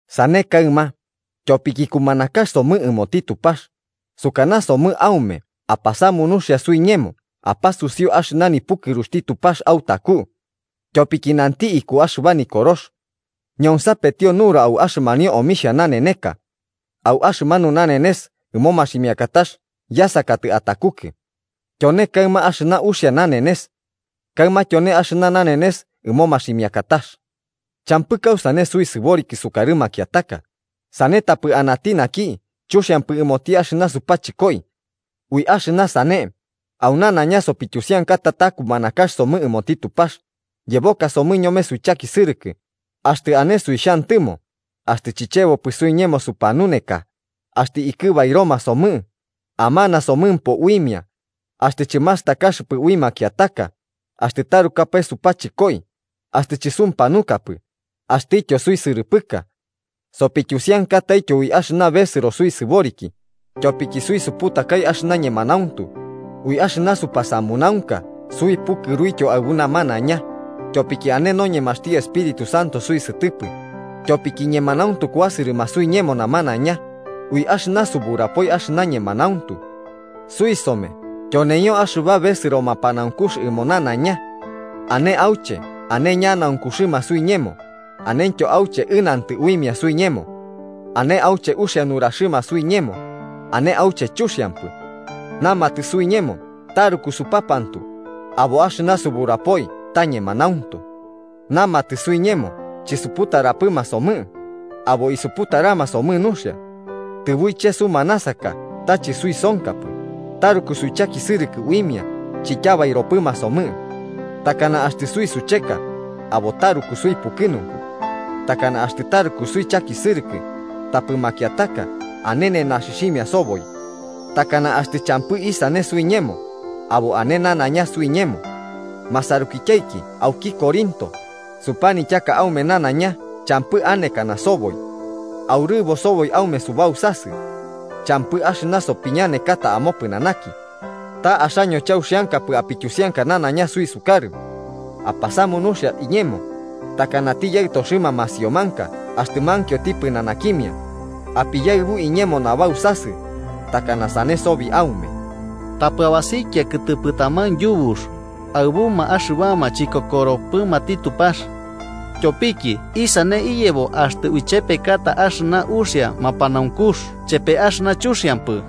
Sane kaɨma, tyopiki kumanakax somɨ ɨmoti Tupax, sukanasomɨ aume apasamu nuxia suiñemo apasusiu axɨna nipukɨruxti Tupax autaku. Tyopiki nanti iku axɨba Nikorox: “Ñonsapetio nura au axɨmanio omixhia naneneka. Au axɨmanu nanenes ɨmo maximiakatax yasakatɨ atakukɨ.” Tyone kaɨma axɨna uxia nanenes. ¡Kaɨma tyone axɨna nanenes ɨmo maximiakatax! Champɨ kausane suisɨboriki sukarɨ makiataka, sane tapɨ anati naki chuxiampɨ ɨmoti axɨna supachɨkoi. Ui axɨna sane, au nanaiña sopityusiankata ta kumanakax somɨ ɨmoti Tupax, yebokasomɨ ñome suichakisɨrɨkɨ, axtɨ ane suixhantɨmo, axtɨ chichebopɨ suiñemo supanuneka, axtɨ ikɨbairoma somɨ, amanasomɨmpo uimia, axtɨ chɨmastakaxɨpɨ ui makiataka, axtɨ tarukapae supachɨkoi, axtɨ chɨsumpanukapɨ axtɨtyo suisɨrɨpɨka. Sopityusiankataityo ui axɨna besɨro suisɨboriki, tyopiki suisuputakai axɨna ñemanauntu, ui axɨna supasamunaunka suipukɨruityo aɨbu namanaiña, tyopiki ane noñemaxti Espíritu Santo suisɨtɨpɨ, tyopiki ñemanauntu kuasɨrɨma suiñemo namanaiña, ui axɨna suburapoi axɨna ñemanauntu. Suisome tyoneio axɨba besɨro mapanaunkux ɨmo nanaiña. Ane auche ane ñanaunkuxɨma suiñemo, anentyo auche ɨnantɨ uimia suiñemo. Ane auche uxia nuraxɨma suiñemo, ane auche chuxiampɨ. Namatɨ suiñemo taruku supapantu, abo axɨna suburapoi ta ñemanauntu. Namatɨ suiñemo chisuputarapɨma somɨ, abo isuputarama somɨ nuxia. Tɨbuiche sumanasaka ta chɨsuisonkapɨ, taruku suichakisɨrɨkɨ uimia chityabairopɨma somɨ. Takana axtɨ suisucheka, abo taruku suipukɨnunku. Takana axtɨ taruku suichakisɨrɨkɨ, tapɨ makiataka ane nenaxɨxhimia soboi. Takana axtɨ champɨ isane suiñemo, abo ane nanaiña suiñemo. Masarukityaiki auki Corinto, supanityaka aume nanaiña champɨ anekana soboi. Aurɨbo soboi aume subausasɨ. Champɨ axɨna sopiñanekata amopɨnanaki. Ta axaño chauxiankapɨ apityusianka nanaiña suisukarɨ. Apasamu nuxia iñemo, takanati yaɨtoxɨma masiomanka axtɨ mankioti pɨnanakimia, apiyaɨbu iñemo nabausasɨ, takana sane sobi aume. Tapɨ abasikia kɨtɨpɨ taman yubux aɨbuma axɨbama chikokoropɨmati Tupax. Tyopiki ¿isane iyebo axtɨ uichepekata axɨna uxia mapanaunkux chepe axɨna chuxiampɨ?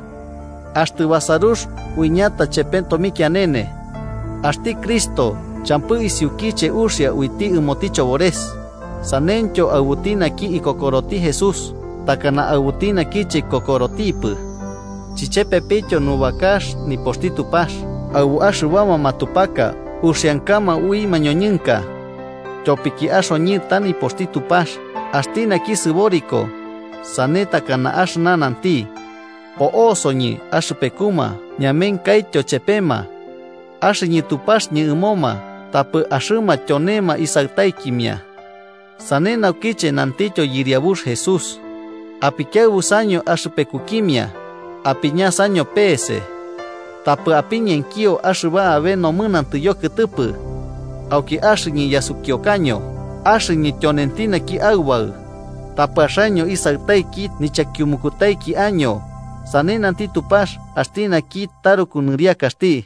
¿Axtɨ basarux uiñata chepe tomikianene? Axti Cristo champɨ isiukiche uxia uiti ɨmoti chobores, saneityo aɨbuti naki ikokoroti Jesús takana aɨbuti naki chikokorotipɨ. Chichepepityo nubakax nipoxti Tupax aɨbu axɨbama matupaka uxiankama ui mañoñɨnka. Tyopiki axoñɨ ta nipoxti Tupax axti naki sɨboriko, sane takana axɨna nanti: “Po'osoñɨ axɨpekuma ñamenkaityo chepema. Axɨñɨ Tupaxɨñɨ ɨmoma tapɨ axɨma tyonema Isaɨtaikimia.” Sane naukiche nantityo Yɨriabux Jesús: “Apikiaɨbusaño axɨpekukimia, apiñasaño pese. Tapɨ apiñenkio axɨba abe nomɨnantɨ yokɨtɨpɨ. Auki axɨñɨ yasukiukaño axɨñɨ tyonenti naki Aubaɨ, tapɨ axaño isaɨtaiki nichakiumukutaiki año, sane nanti Tupax axti naki taruku nɨriakaxti”